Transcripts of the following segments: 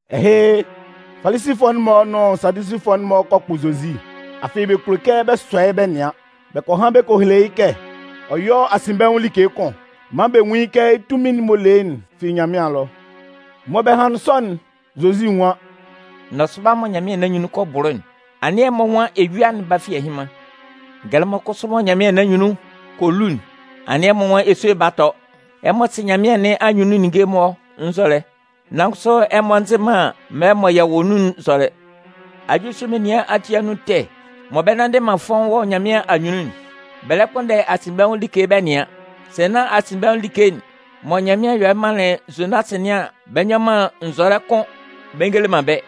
Ɛhɩ, Falisifʋɛ'n-mɔ nʋn Sadusifʋɛ'n-mɔ kɔ kpʋ Zozi, afɩ bɛ kulo kɛ bɛ sɔ yɩ́ bɛ nɩan. Bɛ kɔ han bɛ kɔ hele yɩ́ kɛ ɔ yɔ́ asinbɛnwʋn like kʋn maan bɛ nwún kɛ yɩ́ tunmin'n m'ɔ le yɩ́'n fi Nyanmɩan ɛlɔ. Mɔ bɛ hanlɩn sɔ'n, Zozi nwan: “Nɔsʋba mɔ nyanmɩan nɩn anyunnun kɔ bʋlʋ'n, anɩn ɛmɔ nwan eyua'n 'ba fi ɛhɩnman. Ngɛlɛmɔ kʋsʋ mɔ nyanmɩan nɩn anyunnun kɔ lu'n, anɩn ɛmɔ nwan esue'n 'ba tɔ. Ɛmɔ sɩ nyanmɩan nɩn anyunnun ninnge'n-mɔ nzɔlɛ, nan kʋsʋ ɛmɔ nzɩ man mɛlɛ'n mɔ yɛ wɔ nun'n nzɔlɛ. Ajulisʋ menian ati anun ɛtɛ mɔ bɛ nnanndɩ man fɔ́ʋ́n wɔ Nyanmɩan anyunnun'n, bɛ lɛ kpʋnndɛ asinbɛnwʋn like bɛ nɩan. Sɛ nán asinbɛnwʋn like'n mɔ Nyanmɩan yɔlɩ manlɩn Zonasɩ nɩn an, bɛ nyɔ man nzɔlɛ kʋ́n bɛ ngele man bɛ́.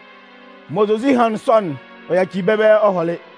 Mɔ Zozi hanlɩn sɔ yuelɩ'n, ɔ yacili bɛ́ ɛbɛlɛ ɔ hɔlɩ.”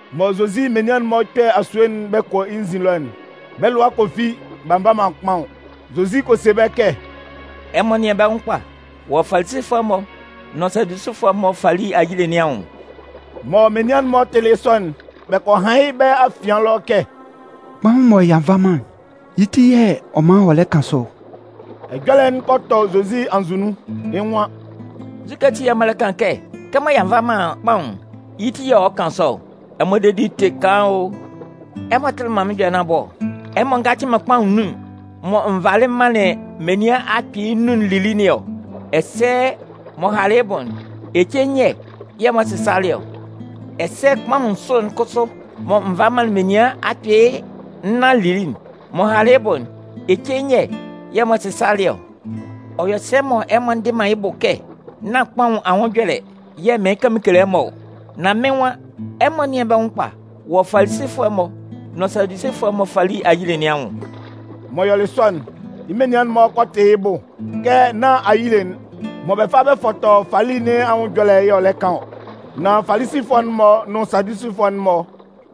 Mɔ Zozi menian'n-mɔ 'kpɛ asue'n bɛ kɔ yɩ́ nzin ɛlɔ'n, bɛ́ lʋa kɔ fi b'a nva man kpaʋn. Zozi kɔ se bɛ́ kɛ: “Ɛmɔ nɩ́an bɛ́ nwʋn kpa wɔ Falisifʋɛ'n-mɔ nʋn Sadusifʋɛ'n-mɔ fali ayile nɩn anwʋn.” Mɔ menian'n-mɔ tɩlɩ yɩ́ sɔ'n, bɛ kɔ han yɩ́ bɛ́ afian ɛlɔ kɛ: “Kpaʋn'n mɔ y'a nva man'n, yɩ́ ti y'ɔ man ɔ lɛ kan sɔ ɔ.” Ɛjɔlɛ'n kɔ tɔ Zozi anzʋ nun, yɩ́ nwan: “Nzukɛ ati yɛ̂ ɛmɔ lɛ kan kɛ kɛmɔ y'a nva man kpaʋn'n, yɩ́ ti yɛ̂ ɔ lɛ kan sɔ ɔ? Ɛmɔ dedi'n tɩ kaan o! Ɛmɔ tɩlɩ man ɛjɔlɛ nɩn abʋ ɔ? Ɛmɔ ngacɩ man kpaʋn nnun'n mɔ n valɩ m manlɩn menian akpɩɩ nnun'n lili nɩn ɔ? Ɛsɛ m'ɔ halɩ yɩ́ bʋ'n, ece nyɛ yɛ̂ ɛmɔ sɩsalɩ ɔ? Ɛsɛ kpaʋn nsʋ'n kʋsʋ mɔ n valɩ m manlɩn menian akpɩɩ nnan'n lili'n, m'ɔ halɩ yɩ́ bʋ'n, ece nyɛ yɛ̂ ɛmɔ sɩsalɩ ɔ? Ɔ yɔ sɛ mɔ ɛmɔ ndɩ man yɩ́ bʋ kɛ nán kpaʋn anwʋn ɛjɔlɛ yɛ̂ mɩɩn kan mɩn kele ɛmɔ'n? Nan mɩ́n nwan: Ɛmɔ nɩ́an bɛ́ nwʋn kpa wɔ Falisifʋɛ'n-mɔ nʋn Sadusifʋɛ'n-mɔ fali ayile nɩn anwʋn.” M'ɔ yɔlɩ sɔ'n, yɩ́ menian'n-mɔ kɔ tɩ yɩ́ bʋ kɛ nán ayile'n mɔ bɛ fa bɛ fɔtɔ fali nɩn anwʋn ɛjɔlɛ y'ɔ lɛ kan ɔ. Nan Falisifʋɛ'n-mɔ nʋn Sadusifʋɛ'n-mɔ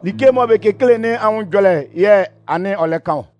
like'n mɔ bɛ kekele nɩn anwʋn ɛjɔlɛ yɛ̂ anɩn ɔ lɛ kan ɔ.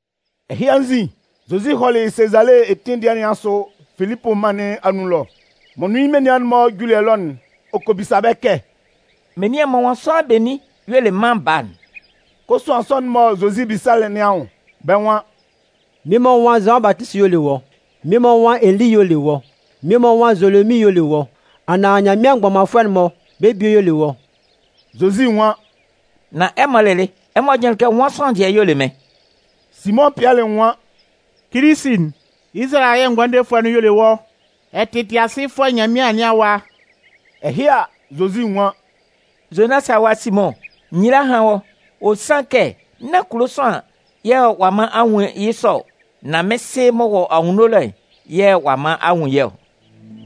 Ɛhɩ anzin, Zozi hɔlɩ Sezale etin dɩɛ nɩn asʋ Filipʋ mân nɩn anun ɛlɔ. M'ɔ nʋn yɩ́ menian'n-mɔ juli ɛlɔ'n, ɔ kɔ bisa bɛ́ kɛ: “Menian'n-mɔ nwan sʋanlan benin y'ɔ le Mân Baa'n?” Kosuan sɔ'n mɔ Zozi bisalɩ nɩn anwʋn, bɛ́ nwan: “Mmie-mɔ nwan Zʋan Batisi y'ɔ le wɔ́, mmie-mɔ nwan Eli y'ɔ le wɔ́, mmie-mɔ nwan Zolomin y'ɔ le wɔ́ anaan Nyanmɩan mgbɔmanfʋɛ'n-mɔ, bɛ́ bie y'ɔ le wɔ́.” Zozi nwan: “Nan ɛmɔ lɩlɩ, ɛmɔ jʋnlɩn kɛ nwan sʋanlan dɩɛ y'ɔ le mɩ́n?” Simʋn Pɩɛlɩ nwan: “Kilisi'n, Izalayɛ Ngʋandefʋɛ'n y'ɔ le wɔ́. Ɛ tɩ Tɩasɩfʋɛ Nyanmɩan nɩn Awa.” Ɛhɩ a, Zozi nwan: “Zonasɩ awa Simʋn, nyila hán wɔ́. Ɔ sanlɩn kɛ nán kulo sʋanlan yɛ̂ ɔ'a man a nwun yɩ́ sɔ ɔ. Nan mɩ́n Sɩ m'ɔ wɔ anwunno ɛlɔ'n yɛ̂ ɔ'a man a nwun yɩ́ ɔ.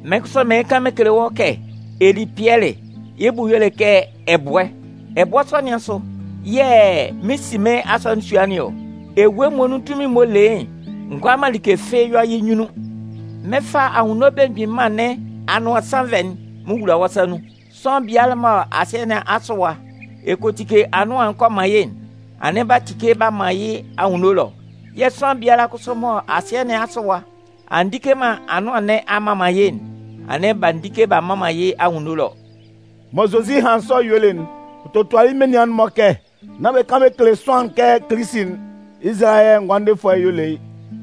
Mɩ́n kʋsʋ mɩɩn kan mɩn kele wɔ́ kɛ ɛ li Pɩɛlɩ (yɩ́ bʋ y'ɔ le kɛ ɛbʋɛ). Ɛbʋɛ sɔ nɩn asʋ yɛ̂ mɩn 'si mɩ́n Asɔnɩn nɩn ɔ. Ewue muonun tunmin'n m'ɔ le yɩ́'n ngʋala man like fɩ́ɩ́ yɔ yɩ́ nyunnun. Mɩn 'fa Anwunno Belemgbin Mân nɩn anʋan sannvɛ'n mɩn wula wɔ́ sa nun. Sʋanlan biala mɔ asɩɛ nɩn asʋ ɛwa ɛ kɔ tike anʋan'n kɔ man yɩ́'n, anɩn b'a tike b'a man yɩ́ anwunno ɛlɔ. Yɛ̂ sʋanlan biala kʋsʋ mɔ asɩɛ nɩn asʋ ɛwa a ndike man anʋan nɩn a mman man yɩ́'n, anɩn b'a ndike b'a mman man yɩ́ anwunno ɛlɔ.” Mɔ Zozi hanlɩn sɔ yuelɩ'n, ɔ totualɩ yɩ́ menian'n-mɔ kɛ nán bɛ kan bɛ kele sʋanlan kɛ Kilisi'n, Izalayɛ Ngʋandefʋɛ'n y'ɔ le yɩ́.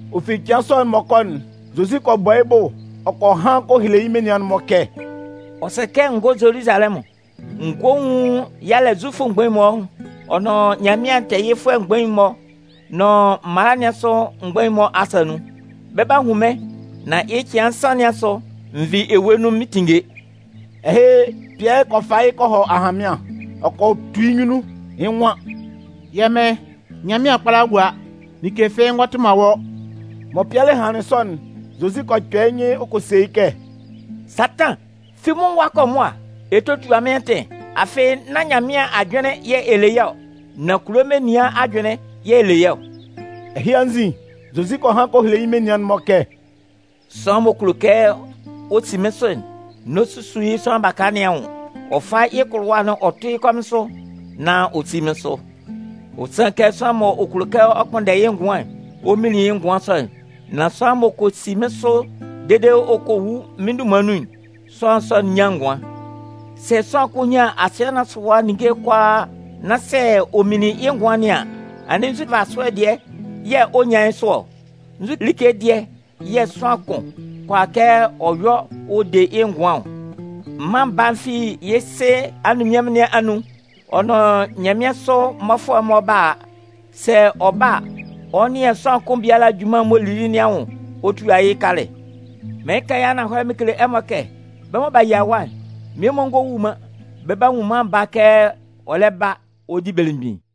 Ɔ fi cɩan sɔ'n m'ɔ kɔ'n, Zozi kɔ bɔ yɩ́ bʋ, ɔ kɔ han kɔ hele yɩ́ menian'n-mɔ kɛ: “Ɔ sɛ kɛ n gɔ́ Zoluzalɛmʋn. N gɔ́ n nwún yalɛ Zufʋ mgbain'n-mɔ, ɔ nʋn Nyanmɩan tɛɛyɩfʋɛ mgbain'n-mɔ nʋn mala nɩn asʋ mgbain'n-mɔ asa nun. Bɛ 'ba hun mɩ́n, nan yɩ́ cɩan nsan nɩn asʋ, n vi ewue nun mɩn 'tinnge.” Ɛhɩ, Pɩɛlɩ kɔ fa yɩ́ kɔ hɔ ahanmɩan, ɔ kɔ tu yɩ́ nyunnun. Yɩ́ nwan: “Yɛ́ Mɩn, Nyanmɩan kpála gúa! Like fɩ́ɩ́ ngɔ tʋ man wɔ́.” Mɔ Pɩɛlɩ hanlɩn sɔ'n, Zozi kɔ kpɛ yɩ́ nyɩn ɔ kɔ se yɩ́ kɛ: “Satan, fi mɩ́n nwʋn ɛwa kɔ mʋa. Ɛ 'totua mɩ́n atɩn, afɩ nán Nyanmɩan ajʋnlɩn yɛ̂ ɛ le yɩ́ ɔ, nan kulo menian'n-mɔ ajʋnlɩn yɛ̂ ɛ le yɩ́ ɔ.” Ɛhɩ anzin, Zozi kɔ han kɔ hele yɩ́ menian'n-mɔ kɛ: “Sʋanlan m'ɔ kulo kɛ ɔ si mɩ́n sʋ'n, n'ɔ susu yɩ́ sʋanlan baka nɩn anwʋn. Ɔ fá yɩ́ kʋlʋwa'n ɔ tʋ́ yɩ́ kɔmɩn sʋ, nán ɔ sí mɩ́n sʋ. Ɔ sanlɩn kɛ sʋanlan m'ɔ kulo kɛ ɔ kpʋnndɛ yɩ́ ngʋan'n, ɔ 'minlin yɩ́ ngʋan sɔ'n. Nan sʋanlan m'ɔ kɔ si mɩ́n sʋ dede ɔ kɔ wu mɩ́n dunman nun'n, sʋanlan sɔ'n 'nyan ngʋan. Sɛ sʋanlan kʋn nyan asɩɛ asʋ ɛwa ninnge'n kʋalaa nan sɛ ɔ minlin yɩ́ ngʋan nɩn an, anɩn nzu nvasʋɛ dɩɛ yɛ̂ ɔ 'nyan yɩ́ sʋ ɔ? Nzu like dɩɛ yɛ̂ sʋanlan kʋn kʋala kɛ ɔ yɔ ɔ de yɩ́ ngʋan ɔ? Mân Baa'n fi yɩ́ Sɩ anunminnyanmʋn nɩn anun ɔ nʋn nyanmɩansʋ mmɔfʋɛ'n-mɔ 'ba a. Sɛ ɔ ba a, ɔ 'nɩan sʋanlan kʋn biala junman'n m'ɔ lili nɩn anwʋn ɔ tua yɩ́ kalɛ. Mɩɩn kan yɩ́ ananhɔlɛ mɩn kele ɛmɔ kɛ: bɛ́ mɔ b'a yia ɛwa'n, mmie-mɔ ngɔ wu man, bɛ 'ba nwun Mân Baa'n kɛ ɔ lɛ ba ɔ di belemgbin.”